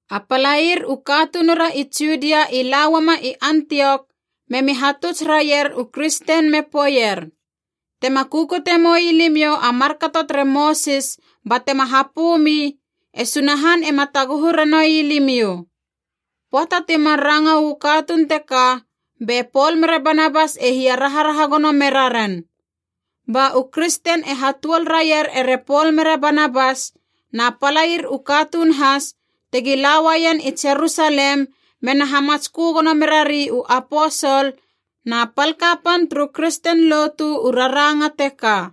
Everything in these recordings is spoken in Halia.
A palair u katunura i Judia i la uama i Antiok memi hatuts raier u kristen me poeier, “Tema kukute moi limiou a markato tere Mosis ba tema hapö mi, e Sunahan ema taguhu ranoui limiou.” Pöata timar ranga uu katuun teka, be Pol mere Banabas e hia raharaha gono me raren. Ba u kristen e hatuol raier ere Pol mere Banabas na palair u katuun has tegi la uaien i Jerusalem mena hamatskö gono merari u aposol na pal kapan turu kristen lotu u raranga teka.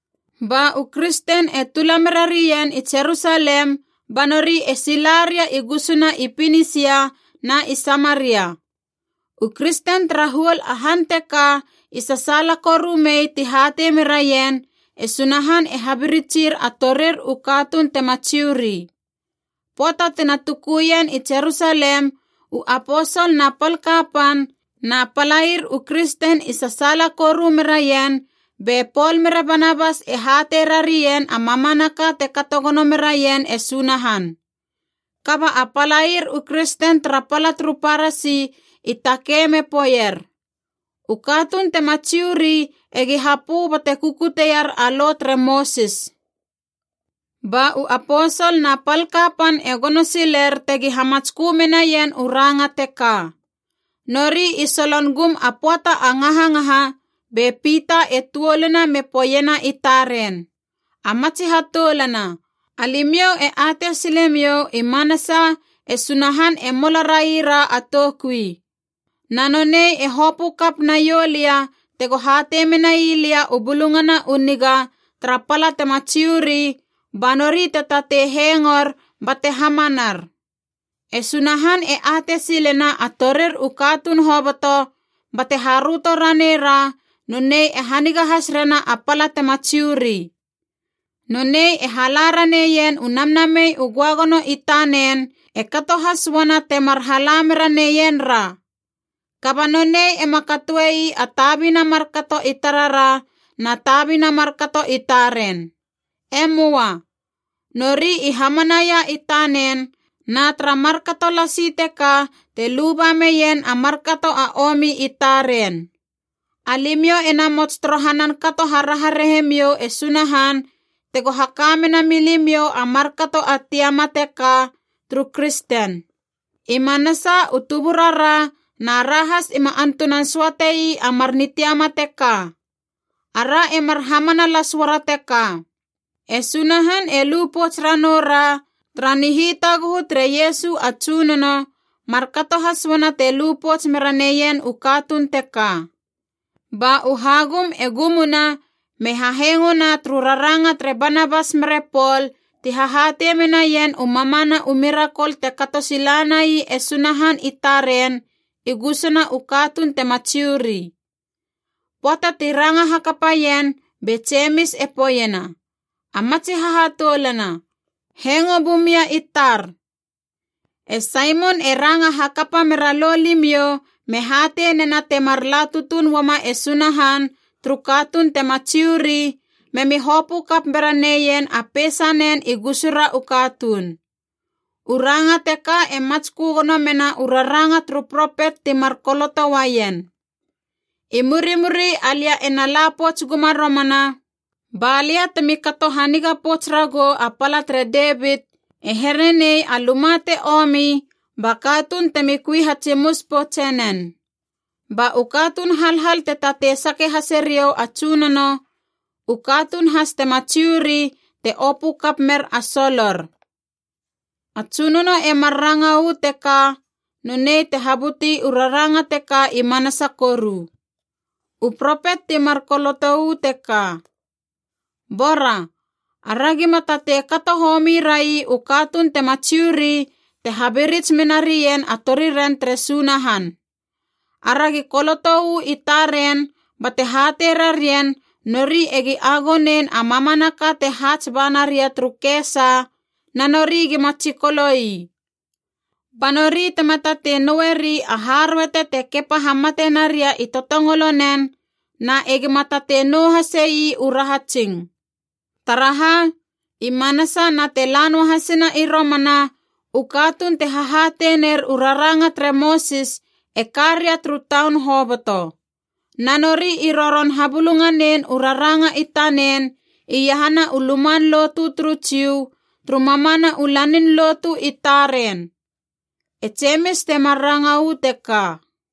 Ba u kristen e tula merarien i Jerusalem ba nori e sila ria i gusuna i Pinisia na i Samaria. U kristen tara huol a han teka i sasaala koru mei ti hatei meraien, e Sunahan e habiritsir a torir u katuun tema Jiu ri. Pöata tina tukuien i Jerusalem, u aposol na pal kapan na palair u kristen i sasaala koru meraien be Pol mere Banabas e hatei rarien a mamanaka te kato gono meraien e Sunahan. Kaba a palair u kristen tara pala turu Parasi i takei me poeier, “U katuun tema Jiu ri egi hapö bate kukutier a Lo tere Mosis.” Ba u aposol na pal kapan e gono siler tegi hamatskö menaien u ranga teka. Nori i solon gum a pöata a ngahangaha be Pita e tuoluna me poeiena i taren, “A matsi hatoulana, alimiou e atei silemiou i manasa e Sunahan e mola raira a toukui. Na nonei e hopö kap naiou lia tego hatei menai lia u Bulungana u Niga tara pala tema Jiu ri, ba nori te tatei hengor bate hamanar. E Sunahan e atei silena a torir u katuun hoboto, bate haröto ranei ra nonei e haniga has rena a pala tema Jiu ri. Nonei e hala raneien u Namnamei u Göagono i tanen, e kato has uana temar hala mera neien ra. Kaba nonei ema katoe ii a tabina markato i tarara na tabina markato i taren. E möa. Nori i hamanaia i tanen, na tara markato lasi teka te luba meien a markato a omi i taren. Alimiou e namots torohanan kato haraharahemiou e Sunahan tego haka mena milimiou a markato a tiama teka turu kristen. I manasa u tuburara na ra has ima antunan söate ii a mar nitiama teka. Ara e mar hamana las uara teka: e Sunahan e lu pouts ranou ra tara nihitaguhu tere Iesu a Tsunono, markato has uana te lu pouts mera neien u katuun teka.” Ba u hagum e gumuna me hahengona turu raranga tere Banabas mere Pol ti hahatei menaien u mamana u mirakol te kato sila nai e Sunahan i taren i gusuna u katuun tema Jiu ri. Pöata ti ranga hakapaien, be Jemis e poeiena, “A matsi hahatoulana, hengo bumia i tar. E Saimon e ranga hakapa mera lo limiou me hatei nena temar la tutuun uama e Sunahan turu katuun tema Jiu ri, memi hopö kap bera neien a peisanen i gusura u katuun. U ranga teka e matskö gono mena u raranga turu propet timar koloto uaien: ‘I murimuri alia ena la pouts guma romana, ba lia temi kato haniga pouts ragou a pala tere Devit, e here nei a luma te omi ba katuun temi kui hatsimus poutse nen. Ba u katuun halhal te tatei sake hase riou a Tsunono, u katuun has tema Jiu ri te opö kap mer a solor. A Tsunono e mar ranga uu teka, nonei te habuti u raranga teka i manasa koru.’ “U propet timar koloto uu teka. “Bora: aragi ma tatei kato homi rai u katuun tema Jiu ri te habirits menarien a toriren tere Sunahan. Aragi koloto uu i taren, bate hatei rarien nori egi agonein a mamanaka te haats ba naria turu kesa na nori gima tsikolo ii. Ba nori tema tatei noueri a haröete te kepa hamate naria i totongolo nen, na egima tatei nou hase ii u rahatsing. Taraha, i manasa na te la noahasina i romana, u katuun te hahatei ner u raranga tere Mosis e ka ria turu taun hoboto. Na nori i roron habulunganein u raranga i tanen iahana u luman lotu turu Jiu turu mamana u lanin lotu i taren.” E Jemis temar ranga uu teka.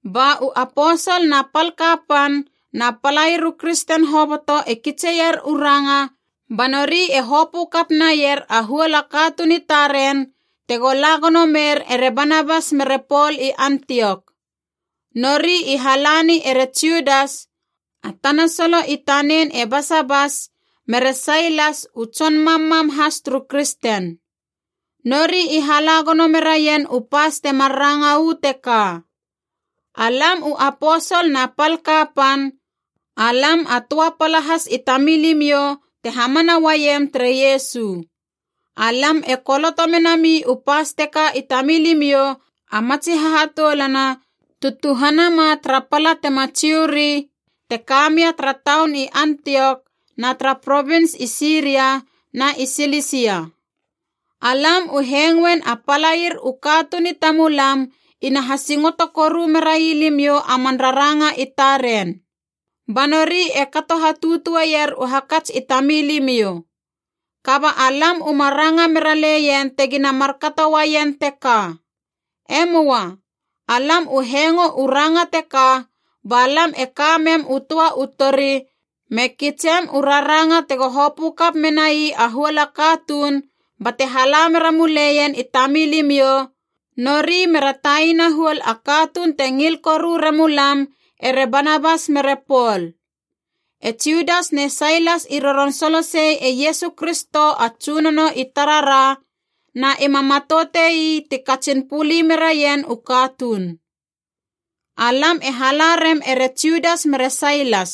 Ba u aposol na pal kapan na palair u kristen hoboto e kitseier u ranga ba nori e hopö kap naier a huol katuun i taren, tego la gono mer ere Banabas mere Pol i Antiok. Nori i halani ere Judas (a tana solo i tanen e Basabas) mere Sailas u tson mammam has turu kristen. Nori i hala gono meraien u pas temar ranga uu teka: “Alam u aposol na pal kapan, alam a töa pala has i tamilimiou te hamana uaiem tere Iesu. Alam e koloto menami u pas teka i tamilimiou a matsi hahatoulana tu tuhana ma tara pala tema Jiu ri, te ka mia tara taun i Antiok na tara provins i Siria na i Silisia. “Alam u hengoen a palair u katuun i tamulam ina hasingoto koru merai limiou a man raranga i taren. Ba nori e kato hatutueier u hakats i tamilimiou. Kaba alam uma ranga mera leien tegina markato uaien teka. E möa. Alam u hengo u ranga teka ba lam e ka mem u töa u tori me kitsem u raranga tego hopö kap menai a huol katuun bate hala mera muleien i tamilimiou, nori mera taina huol a katuun te ngil koru remuma lam, ere Banabas mere Pol. E Judas ne Sailas i roron solosei e Iesu Kristo a Tsunono i tarara, na ima matoute ii ti katsin puli meraien u katuun. Alam e hala rem ere Judas mere Sailas.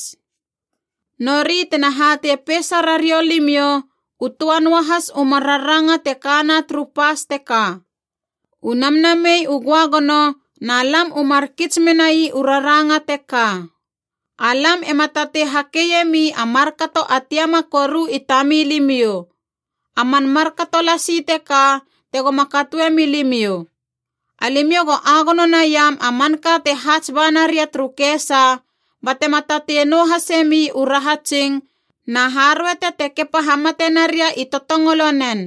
Nori tena hatei peisa rariou limiou u töa noahas u mar raranga te kana turu pas teka. U Namnamei u Göagono na lam u mar kits menai u raranga teka: alam ema tatei hakeiemi a markato a tiama koru i tamilimiou. A man markato lasi teka tegoma katoe milimiou: alimiou go agono naiam a manka te haats ba naria turu kesa, batema tatei nou hasemi u rahatsing na haröete te kepa hamate naria i totongolonen.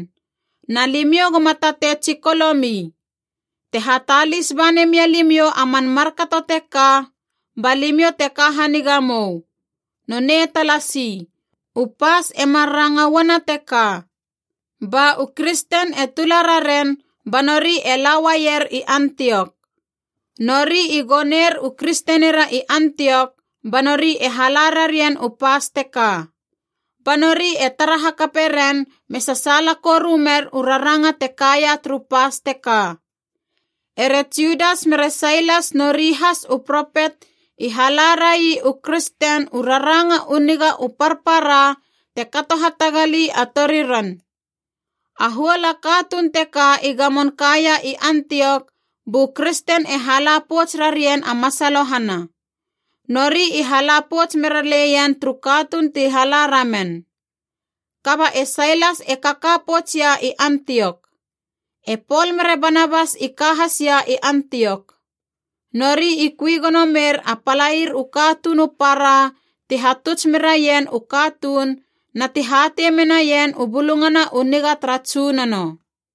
Na limiou goma tatei tsikolomi. Te hatalis ba nemia limiou a man markato teka, ba limiou te ka haniga mou. Nonei talasi.” U pas e mar ranga uana teka. Ba u kristen e tula raren ba nori e la uaier i Antiok. Nori i goner u kristenira i Antiok ba nori e hala rarien u pas teka. Ba nori e tara hakape ren me sasaala koru mer u raranga te kaia turu pas teka. Ere Judas mere Sailas nori has u propet i hala rai u kristen u raranga u niga u parpara te kato hatagali a toriren. A huol a katuun teka i gamon kaia i Antiok, bu kristen e hala pouts rarien a masalohana. Nori i hala pouts mera leien turu katuun ti hala ramen. Kaba e Sailas e kaka poutsia i Antiok. E Pol mere Banabas i ka hasia i Antiok. Nori i kui gono mer a palair u katuun u para ti hatuts meraien u katuun na ti hatei menaien u Bulungana u Niga tara Tsunono.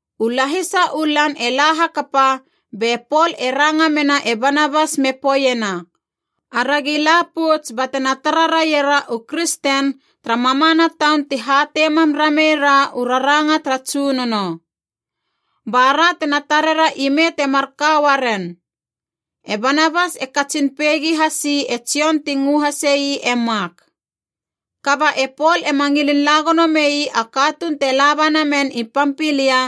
U lahisa u lan e la hakapa, be Pol e ranga mena e Banabas me poeiena, “Aragi la pouts batena tara raiera u kristen tara mamana taun ti hatei mam ramei ra u raranga tara Tsunono. Ba ra tena tarera ime te marka uaren.” E Banabas e katsin peigi hasi e Jon ti ngö hase ii e Mak. Kaba e Pol ema ngilin la gono mei a katuun te laba namen i Pampilia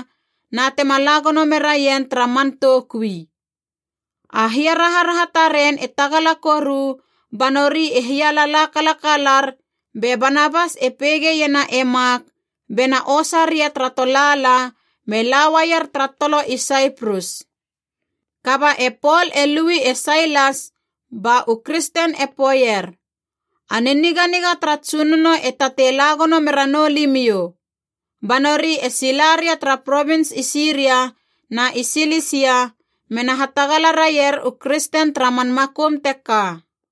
na tema la gono meraien tara man toukui. A hiaraharaha taren e tagala koru ba nori e hialala kalakalar be Banabas e peigeiena e Mak be na osa ria tara tolaala me lauaier tara tolo i Saiprus. Kaba e Pol e lui e Sailas, ba u kristen e poeier, “A niniganiga tara Tsunono e tatei la gono mera noulimiou.” Ba nori e sila ria tara provins i Siria na i Silisia, mena hatagala raier u kristen tara man makum teka.